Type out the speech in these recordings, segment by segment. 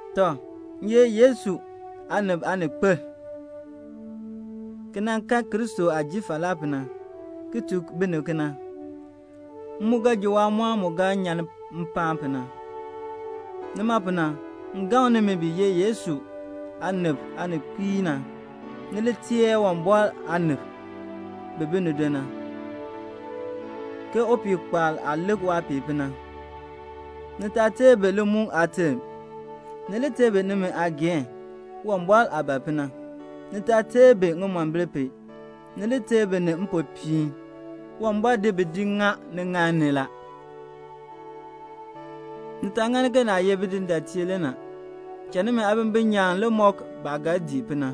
Tɔ, m ye Yesu aanib aaninkpil, ki nan kan Kristo aah jin falaa pu na, ki tuk binib kena. M mu ga ji waamɔɔn mu ga kpiir na. Nima pu na, m gaŋ nimi bi ye Yesu aanib aaninkpiib na, ni li ter Uwumbɔr aanib bi bi nido na, ke upihkpaal aah lik waapiih pu na. Ni taa ter bi limukl aaterm. Ni li ter bi nimi aageehn, Uwumbɔr aah ban pu na. Ni taa ter bi ŋimombil pu, ni li ter bi ni mpopiin. Uwumbɔr di bi di ŋa niŋaal ni la. Ni taa ŋani ke ni ye bidindaatiib. Cha nimi aabimbin nyaan le mɔk bi baah ga dii pu na.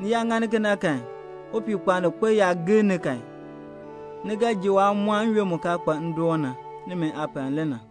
Ni yaa ŋani kena kan, upihkpaalninkpil yaa gir ni kan, ni ga ji waamɔɔn n-yoonn mu kaa kpa ndoon na. Nimi aapal le na.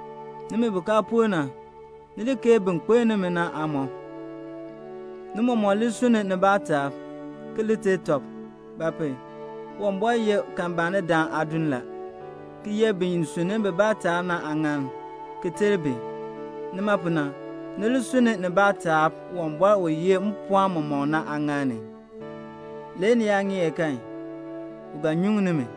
Nimi bi kaa por na, ni li keei bin kpiln nimi na aamɔb. Ni mɔmɔk li sunn nibaa taab, ki li ter tɔb. Ba pu? Uwumbɔr ye kalmbaanidam aadin la, ki ye bin sunni bibaa taab na aaŋan, ki ter bi. Nima pu na, ni li sunni nibaa taab Uwumbɔr u yeh mpɔɔn mɔmɔk na aaŋaal ni. Le ni yaa ŋeer kan, u ga nyuŋ nimi.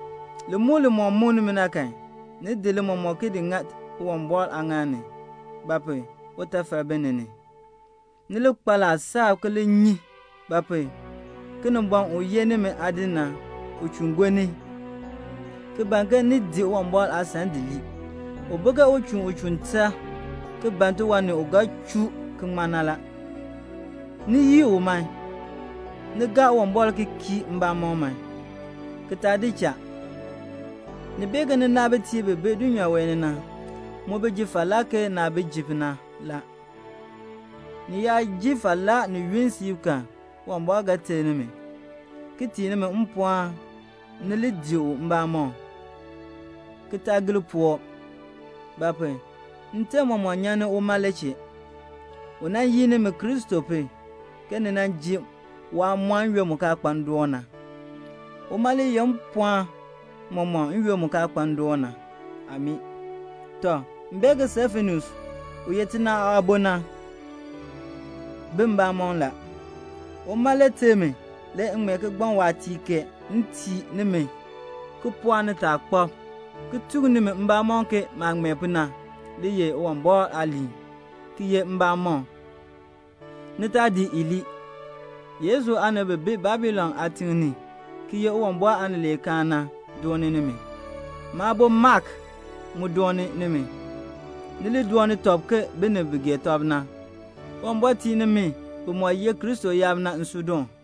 Limukl limɔk muk nimi na kan, ni di li mɔmɔk ki di ŋa Uwumbɔr aaŋaal ni; ba pu? utafal bi ni ni. Ni li kpa laasab ki li nyi; ba pu? Kinimbɔŋ u ye nimi aadin na, u chuun gonni, ki ban ke ni di Uwumbɔr aasan di lii. U bi ke uchinn u chuun tar, ki ban tiwan ni u ga chuu ki ŋman na. Ni yii u man. Ni gaa Uwumbɔr ki kii mbamɔm man, ki taa di cha. Ni bee ke ninaabitiib bi bi dulnyaa wee ni na, bi mu ji falaa ke naah ji pu na. Ni yaa ji falaa ni yunn siib kan, Uwumbɔr ga ter nimi, ki tii nimi mpɔɔn ni li dii u mbamɔm, ki taa gir puwɔb. Ba pu? nterm mɔmɔk nyan ni uma le chee. U nan yin nimi Kristo pu, ke ni ji waamɔɔn n-yoonn mu kaa kpa ndoon na. Uma le yeh mpɔɔn mɔmɔk n-yoonn mu kaa kpa ndoon na. Amii. Tɔ, m bee ke Silfanus, u ye tina aabo na, bi mbamɔm la. Uma le ter mi le m ŋmee kigbaŋ waatiir kee m tii nimi ki pɔɔk nitaakpab, ki tuk nimi mbamɔn ke maah ŋmee pu na le ye Uwumbɔr aaliin, ki ye mbamɔn. Ni taa di i di lii. Yesu aanib bi bi Babilon aatiŋ ni ki ye Uwumbɔr aanileekaan na, bi dooni nimi. Maabo Mak mu doon nimi. Ni li dooni tɔb ke binib bi gee tɔb na. Uwumbɔr tii nimi bimɔk ye Kristo yaab na nsuudoon.